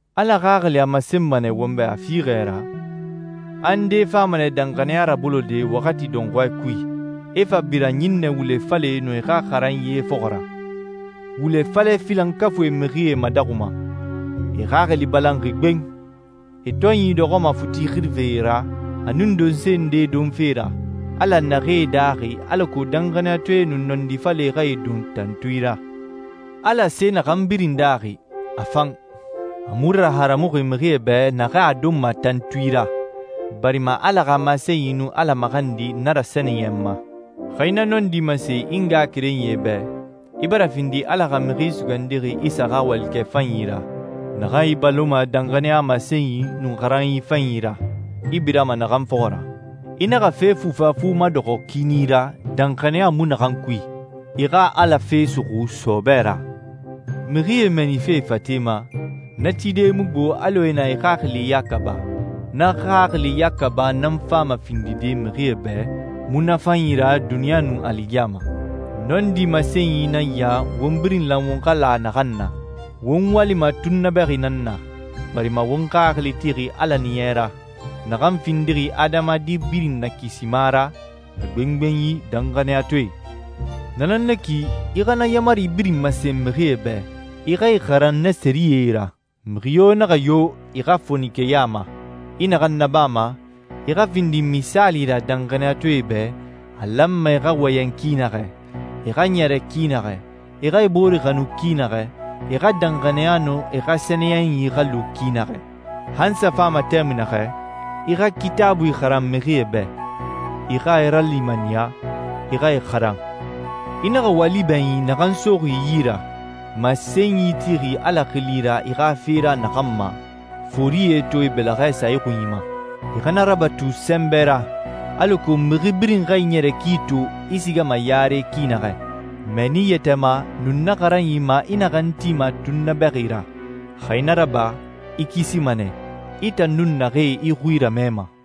Ala Xaxili a masenma nɛ won bɛ a fiixɛ ra, a ndee fama nɛ danxaniya rabolode waxati dɔnxɔɛ kui, e fa bira ɲinnɛ wule falɛe nun e xa xaranyie fɔxɔ ra. Wule falɛ filankafuie mixie madaxuma. E xaxili balanxi gben. E tɔnyi dɔxɔma futi xirife ra, a nun donse ndee donfe ra, Ala naxee daaxi alako danxaniyatɔɛe nun nɔndi falɛe xa e don tantui ra. Ala se naxan birin daaxi, a fan. A mu raharamuxi mixie bɛ naxee a donma tantui ra, barima Ala xa masenyi nun Ala maxandi na rasɛniyɛnma. Xa i na nɔndi masen i ngaxakerenyie bɛ, i bara findi Ala xa Mixi Sugandixi Isa xa walikɛ fanyi ra, naxan i baloma danxaniya masenyi nun xaranyi fanyi ra, i birama naxan fɔxɔ ra. I naxa fe fufafu madɔxɔ kiini ra danxaniya mu naxan kui. I xa Ala fe suxu sɔɔbɛ ra. Mixie mɛɛnife e fate ma, na tide mu gbo alɔ e na e xaxili yaka ba. Na xaxili yaka ba nan fama findide mixie bɛ munafanyi ra duniɲa nun aligiyama. Nɔndi masenyi nan ya won birin lan won xa la naxan na: Won walima tunnabɛxi nan na, barima won xaxili tixi Ala Ɲiɲɛ ra, naxan findixi adamadi birin Nakisima ra, a gbengbenyi danxaniyatɔɛe. Na nan na ki, i xa na yaamari birin masen mixie bɛ, i xa e xaran na sɛriyɛe ra. Mixi yo naxa yo i xa fonikeya ma. I naxan nabama, i xa findi misaali ra danxaniyatɔɛe bɛ a lanma e xa wɔyɛn ki naxɛ, e xa ɲɛrɛ ki naxɛ, e xa e bore xanu ki naxɛ, e xa danxaniya nun e xa sɛniyɛnyi xa lu ki naxɛ. Han n sa fama tɛmui naxɛ, i xa Kitaabui xaran mixie bɛ, i xa e ralimaniya, i xa e xaran. I naxa wali bɛɲin naxan soxi i yi ra, masenyi tixi Ala xili ra i xa fe ra naxan ma, forie to e bɛlɛxɛ sa i xunyi ma. I xa na rabatu sɛnbɛ ra, alako mixi birin xa i ɲɛrɛ ki to i sigama yare ki naxɛ. Mɛɛni i yɛtɛ ma, nun na xaranyi ma i naxan tima tunnabɛxi ra. Xa i na raba i kisima nɛ, i tan nun naxee i xui ramɛma.